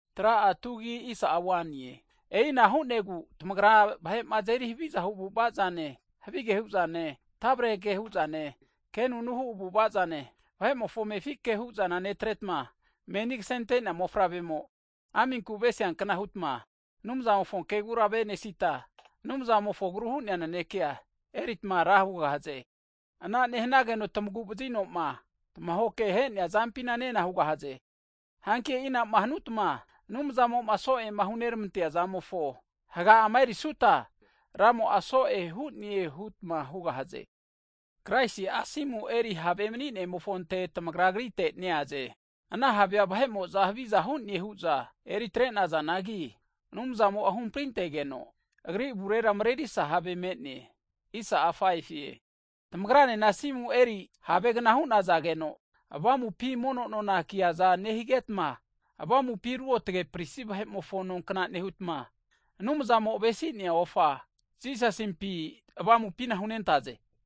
Hagi e'ina hu'negu tamagra vahe'ma azeri havizahu avu'avazane, havige hu'zane, tavrenke hu'zane, kenunu hu avu'ava'zane, vahe'mofo amefi ke hu'zana netretma, meni kasentea mofavremo aminku avesiankna hutma Anumzamofo kegura tamavenesita, Anumzamofo agru hu'nea nanekea e'neritma nena hugahaze. Ana nehanageno tamagu vazino'ma, tamahoke ahe'nea zampina nena hugahaze. Hanki e'inama hutma Anumzamo'ma so'ema huneramantea zamofo haga'ama erisuta, Ramo'a so'e hu'ne hutma hugahaze. Hagi Kraisi'a asimu eri have mani'nemofonte tamagra Agrite neaze. Ana havea vahe'mo'za haviza hu'ne hu'za eri atrenazanagi, Anumzamo'a huhamprintegeno, Agri avurera mrerisa have me'ne. Tamagranena asimu eri havegna hu'nazageno, avamupi mono nona kiaza nehigetma, avamupi ruotge pristi vahe'mofo nonkna nehutma, Anumzamo avesi'nea ofa Jisasimpi avamupina hunentaze.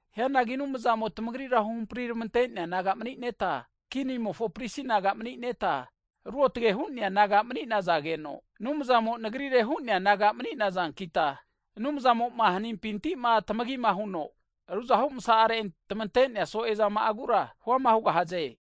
Hianagi Anumzamo tamagrira huhampriramante'nea naga mani'neta, kinimofo pristi naga mani'neta, ruotge hu'nea naga mani'nazageno, Anumzamo'ma Nagri nagare huno hu'nea naga mani'nazankita, Anumzamo'ma hanimpinti'ma tamagima huno, ruzahu masazama'are'ma tamante'nea so'ezama'agura huama hugahaze.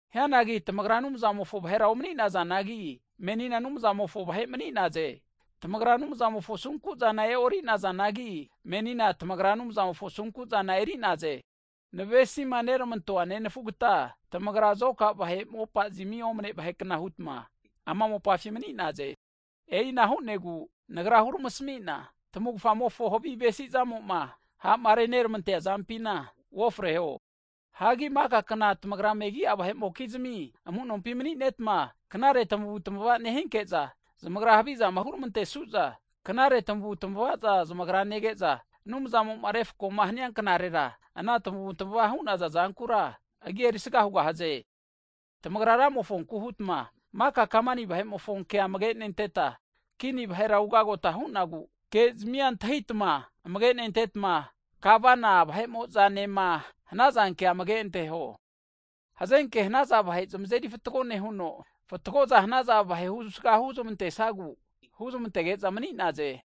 Hianagi kora tamagra Anumzamofo vahera omani'nazanagi, menina Anumzamofo vahe mani'naze. Tamagra Anumzamofo asunkuzana e'orinazanagi, menina tamagra Anumzamofo asunkuzana eri'naze. Hagi navesima neramantoa nenafugta, tamagra zoka vahe mopazmi omne vahekna hutma ama mopafina mani'naze. E'ina hu'negu, tamavufamofo havi avesizamo'ma ha'ma reneramantea zampina uofreho hu'na nagra huneramasamue. Hagi maka kna tamagra megi'a vahe'mokizmi amu'nompima mani'netma, knare tamavutmava nehinke'za, zamagrama huhavizama huramantesu'za, knare tamavu'tamavaza zamagra nege'za, Anumzamo'ma refkoma hania knarera, ana tamavutamava hu'naza zankura, Agi erisaga hugahaze. Tamagra Ramofonku hutma, maka kamani vahe'mofo kea amage nentetma, kini vahera ugagota hu'nagu, kezmia antahitama amage nentetma, Gavana vahe'mo'zanema hanaza kea amage anteho. Hazenke hanaza vahe zamazeri fatgo nehuno, fatgoza hanaza vahe husga huzmantesagu huzmantege'za mani'naze.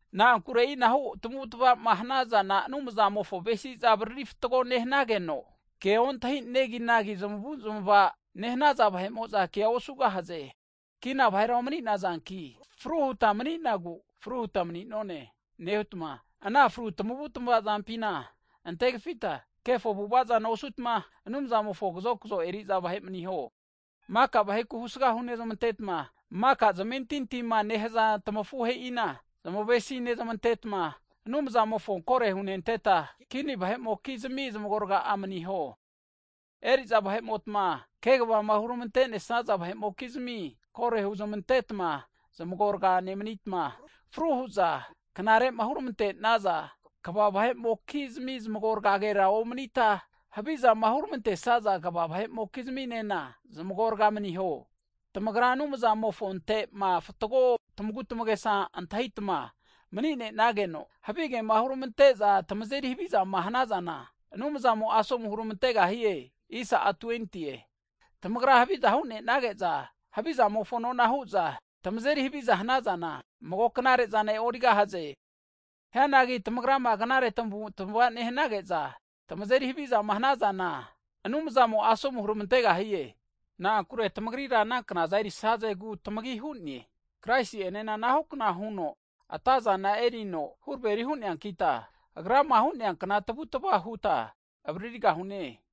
Na'ankure e'inahu tamavutmavama hanazana Anumzamofo avesiza avaririta fatgo nehanageno, ke ontahi neginagi zmavuzmavama nehaza vahe'mo'za kea osugahaze. Kina vahera omi'nazanki, fru huta mani'nagu, fru huta mani'none nehutma, ana fru tamavutamava zampina antegafita, kefo avu'ava zana osutma, Anumzamofo kazokzo eriza vahe maniho. Maka vaheku husga hunezmantetma, maka zamentintima nehaza tamafuhe'ina zmavesinezmantetma, Anumzamofonku kore hunentetma, kini vahe'mokizmi zamagorga maniho. Eri'za vahe'motma, kegavama huramante'nesaza vahe'mokizmia kore huzmantetma zamagorga nemanitma, fru hu'za knare'ma huramante'naza kva vahe'mokizmi zamagorgagera nemanita, havizama huramantesaza kva vahe'mokizminena zamagorga maniho. Tamagrama Anumzamofonte'ma fatgo tamagu tamagesa antahitama mani'nenageno, havigema huramante'za tamazeri havizama hanazana, Anumzamo asomu huramantegahie. Tamagrama haviza hu'nenage'za, havizamofo nona hu'za tamazeri haviza hanazana, mago knare'zana e'origahaze. Hianagi tamagrama knare tamavu'tamavazama nehanage'za, tamazeri havizama hanazana, Anumzamo'a asomu huramantegahie. Na'ankure tamagrira ana knaza erisazegu tamagi hu'ne. Kraisi enena anahukna huno atazana erino huraveri hu'neankita, Agrama hu'neankna tavutava huta avaririgahune.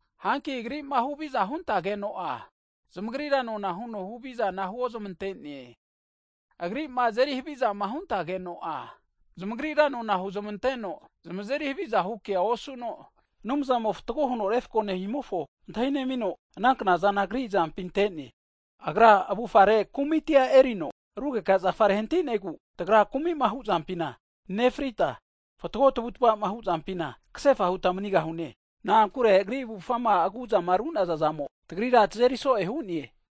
Hanki Agri'ma huhavizama huntageno'a, zamagrira nona huno huhavizana huozmante'ne, Agri'ma azeri havizama huntageno'a, zamagrira nona huozmanteno zamazeri havizahu kea osuno, Anumzamo fatgo huno refko nehimofo antahi nemino, ana knazana Agri azampi ante'ne. Agra avufare kumiti erino rugeka zafare hantinegu, tagra kumi'ma hu'zampina nefrita, fatgo tavutava'ma huzampina, kasefa huta manigahune. Na'ankure Agri avufgama aguzama ru'nazazamo, tagrira tazeri so'e hu'ne.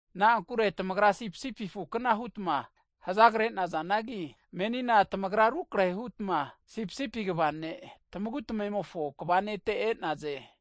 Na'ankure tamagra sipisipi afukna hutma hazagre'nazanagi, menina tamagra rukrehe hutma sipisipi kva ne, tamagu tamemofo kva Nete e'naze.